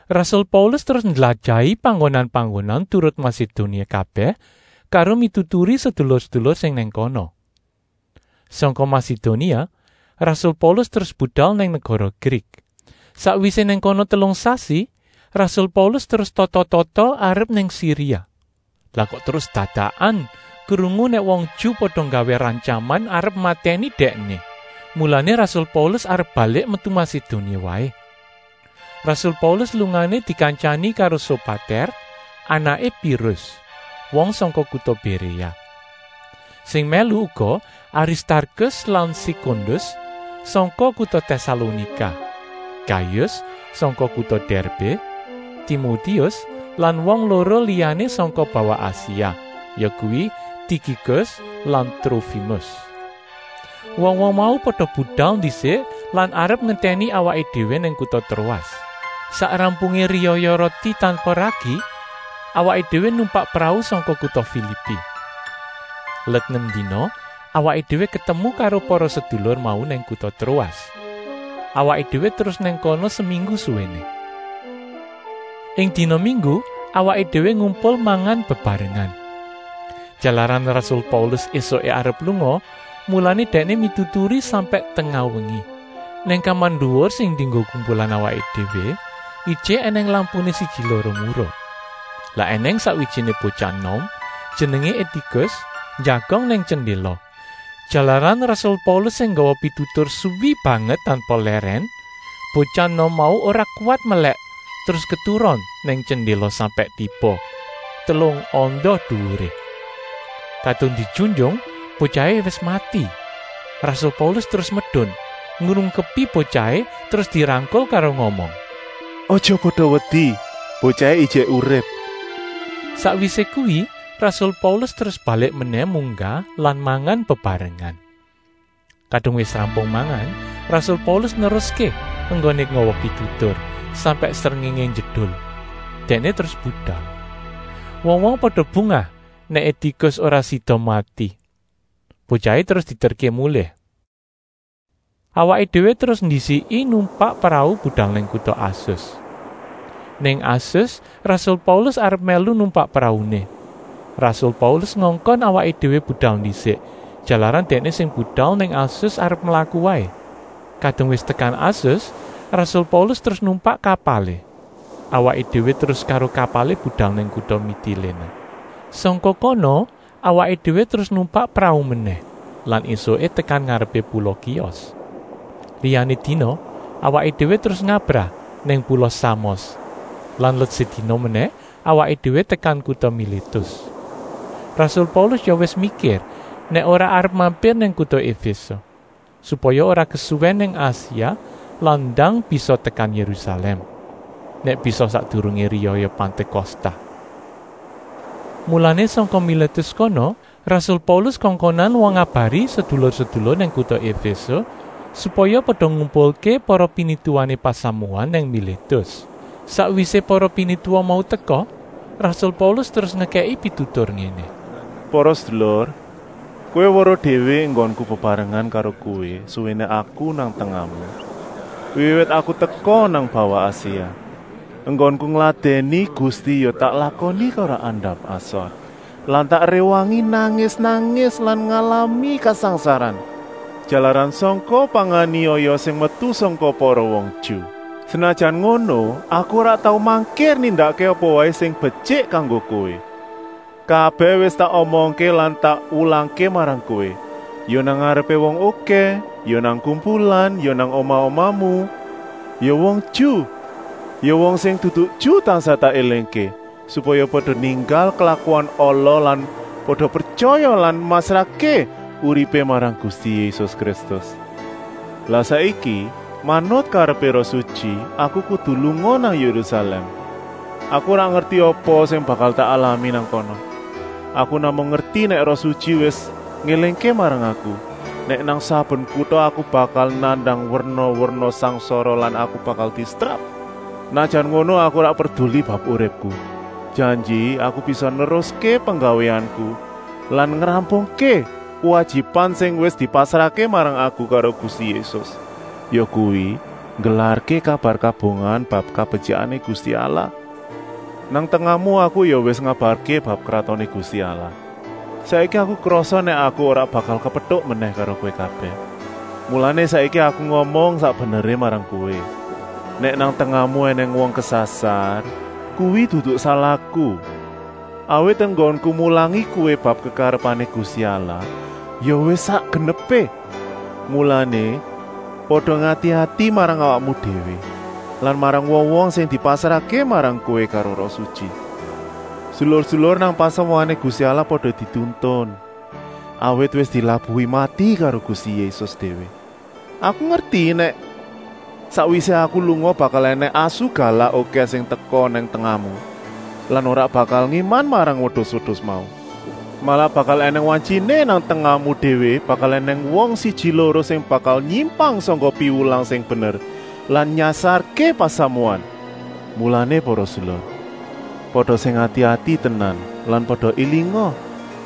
Rasul Paulus terus ndlajahi panggonan-panggonan turut Masedonia kabèh karo mituturi sedulur-sedulur sing nang kono. Sangka Masedonia rasul Paulus terus budal nang negara Grik. Sakwisé nang kono telung sasi rasul Paulus terus tata-tata arep nang Siria. Lah kok terus dadakan krungu nèk wong Ju pada nggawé rantyaman arep matèni dèkné. Mulané rasul Paulus arep balik metu Masedonia waé. Rasul Paulus lungané dikantyani karo Sopatèr, anaké Pirus, wong sangka kuta Béréa. Sing mèlu uga Aristarkus lan Sekundus sangka kuta Tèsalonika, Gayus sangka kuta Dèrbé, Timotius lan wong loro liyané sangka bawah Asia, yakuwi Tikikus lan Trofimus. Wong-wong mau pada budal ndisik lan arep ngentèni awaké déwé nang kuta Troas. Sak rampungé riyaya Roti tanpa Ragi awaké déwé numpak prau sangka kuta Filipi. Let nem dina awaké déwé ketemu karo para sedulur mau nang kuta Troas. Awaké déwé terus nang kono seminggu suwéné. Ing dina minggu awaké déwé ngumpul mangan bebarengan. Jalaran rasul Paulus ésuké arep lunga, mulané dèkné mituturi sampèk tengah wengi. Nang kamar nduwur sing dienggo kumpulan awaké déwé ijik ènèng lampuné siji-loro murup. Lah ènèng sakwijiné botyah enom, jenengé Etikus, njagong nang jendéla. Jalaran rasul Paulus sing nggawa pitutur suwi banget tanpa lèrèn, botyah enom mau ora kuwat melèk terus keturon nang jendéla sampèk tiba, telung anda duwuré. Kadung dijunjung botyahé wis mati. Rasul Paulus terus medun, ngrungkepi botyahé terus dirangkul karo ngomong: “Aja pada wedi, botyahé ijik urip!” Sakwisé kuwi rasul Paulus terus balik menèh munggah lan mangan bebarengan. Kadung wis rampung mangan, rasul Paulus neruské enggoné nggawa pitutur, sampèk srengéngé njedul. Dèkné terus budal. Wong-wong pada bungah nèk Etikus ora sida mati. Botyahé terus dieterké mulih. Awaké déwé terus ndisiki numpak prau budal nang kuta Asus. Nang Asus rasul Paulus arep mèlu numpak prauné. Rasul Paulus ngongkon awaké déwé budal ndisik, jalaran dèkné sing budal nang Asus arep mlaku waé. Kadung wis tekan Asus rasul Paulus terus numpak kapalé. Awaké déwé terus karo kapalé budal nang kuta Mitiléné. Sangka kana awaké déwé terus numpak prau menèh lan ésuké tekan ngarepé pula Kios. Liyané dina awaké déwé terus ngabrah nang pula Samos lan let sedina menèh awaké déwé tekan kuta Milétus. Rasul Paulus ya wis mikir nèk ora arep mampir nang kuta Efése, supaya ora kesuwèn nang Asia lan ndang bisa tekan Yérusalèm, nèk bisa sakdurungé riyaya Pantékosta. Mulané sangka Milétus kono rasul Paulus kongkonan wong ngabari sedulur-sedulur nang kuta Efése, supaya pada ngumpulké para pinituwané pasamuan nang Milétus. Sakwisé para pinituwa mau teka, rasul Paulus terus ngekèki pitutur ngéné: “Para sedulur, kowé weruh déwé enggonku bebarengan karo kowé suwéné aku nang tengahmu, wiwit aku teka nang bawah Asia. Enggonku ngladèni Gusti ya tak lakoni karo andap-asor lan tak réwangi nangis-nangis lan ngalami kasangsaran, jalaran sangka panganiaya sing metu sangka para wong Ju. Senajan ngono aku ora tau mangkir nindakké apa waé sing betyik kanggo kowé. Kabèh wis tak omongké lan tak wulangké marang kowé, ya nang ngarepé wong okèh, ya nang kumpulan nang omah-omahmu. Ya wong Ju, ya wong sing dudu Ju tansah tak élingké, supaya pada ninggal klakuan ala lan pada pretyaya lan masrahké uripé marang Gusti Yésus Kristus. Lah saiki, manut karepé Roh Sutyi, aku kudu lunga nang Yérusalèm. Aku ora ngerti apa sing bakal tak alami nang kana. Aku namung ngerti nèk Roh Sutyi wis ngélingké marang aku, nèk nang saben kuta aku bakal nandang werna-werna sangsara lan aku bakal disetrap. Senajan ngono aku ora perduli bab uripku, janji aku bisa neruské penggawéanku lan ngrampungké kuwajiban sing wis dipasrahké marang aku karo Gusti Yésus, yakuwi, nggelarké kabar kabungahan bab kabetyikané Gusti Allah. “Nang tengahmu aku ya wis ngabarké bab Kratoné Gusti Allah. Saiki aku krasa nèk aku ora bakal kepetuk menèh karo kowé kabèh. Mulané saiki aku ngomong sak beneré marang kowé: nèk nang tengahmu ènèng wong kesasar, kuwi dudu salahku. Awit enggonku mulangi kowé bab kekarepané Gusti Allah ya wis sak genepé. Mulané, pada ngati-ati marang awakmu déwé lan marang wong-wong sing dipasrahké marang kowé karo Roh Sutyi. Sedulur-sedulur nang pasamuané Gusti Allah pada dituntun, awit wis dilabuhi mati karo Gusti Yésus déwé. Aku ngerti nèk sakwisé aku lunga bakal ènèng asu galak okèh sing teka nang tengahmu lan ora bakal ngéman marang wedus-wedus mau. Malah bakal ènèng wantyiné nang tengahmu déwé bakal ènèng wong siji-loro sing bakal nyimpang sangka piwulang sing bener lan nyasarké pasamuan. Mulané para sedulur, pada sing ati-ati tenan lan pada élinga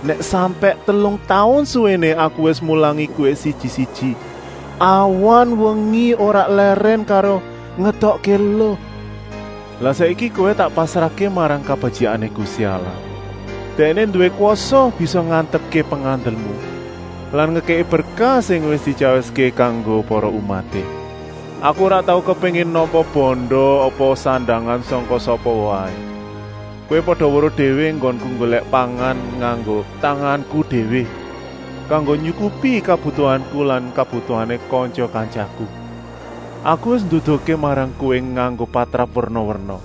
nèk sampèk telung taun suwéné aku wis mulangi kowé siji-siji, awan-wengi ora lèrèn karo ngetokké eluh. “Lah saiki kowé tak pasrahké marang kabetyikané Gusti Allah. Dèkné nduwé kwasa bisa ngantepké pengandelmu lan ngekèki berkah sing wis dityawiské kanggo para umaté. Aku ora tau kepéngin nampa banda apa sandangan sangka sapa waé. Kowé pada weruh déwé enggonku nggolèk pangan nganggo tanganku déwé, kanggo nyukupi kabutuhanku lan kabutuhané kantya-kantyaku. Aku wis nduduhké marang kowé nganggo patrap werna-werna,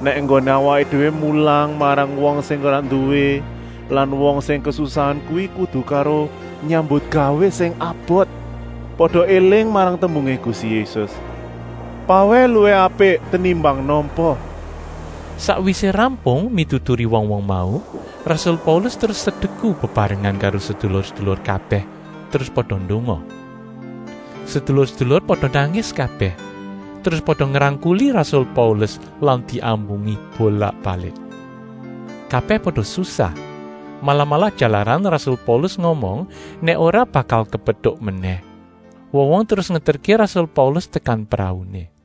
nèk enggoné awaké déwé mulang marang wong sing ora nduwé lan wong sing kesusahan kuwi kudu karo nyambutgawé sing abot. Pada éling marang tembungé Gusti Yésus: ‘Pawèh luwih apik tenimbang nampa.’” Sakwisé rampung mituturi wong-wong mau, rasul Paulus terus sedeku bebarengan karo sedulur-sedulur kabèh terus pada ndonga. Sedulur-sedulur pada nangis kabèh, terus pada ngrangkuli rasul Paulus lan diambungi bolak-balik. Kabèh pada susah, malah-malah jalaran rasul Paulus ngomong nèk ora bakal kepetuk menèh. Wong-wong terus ngeterké rasul Paulus tekan prauné.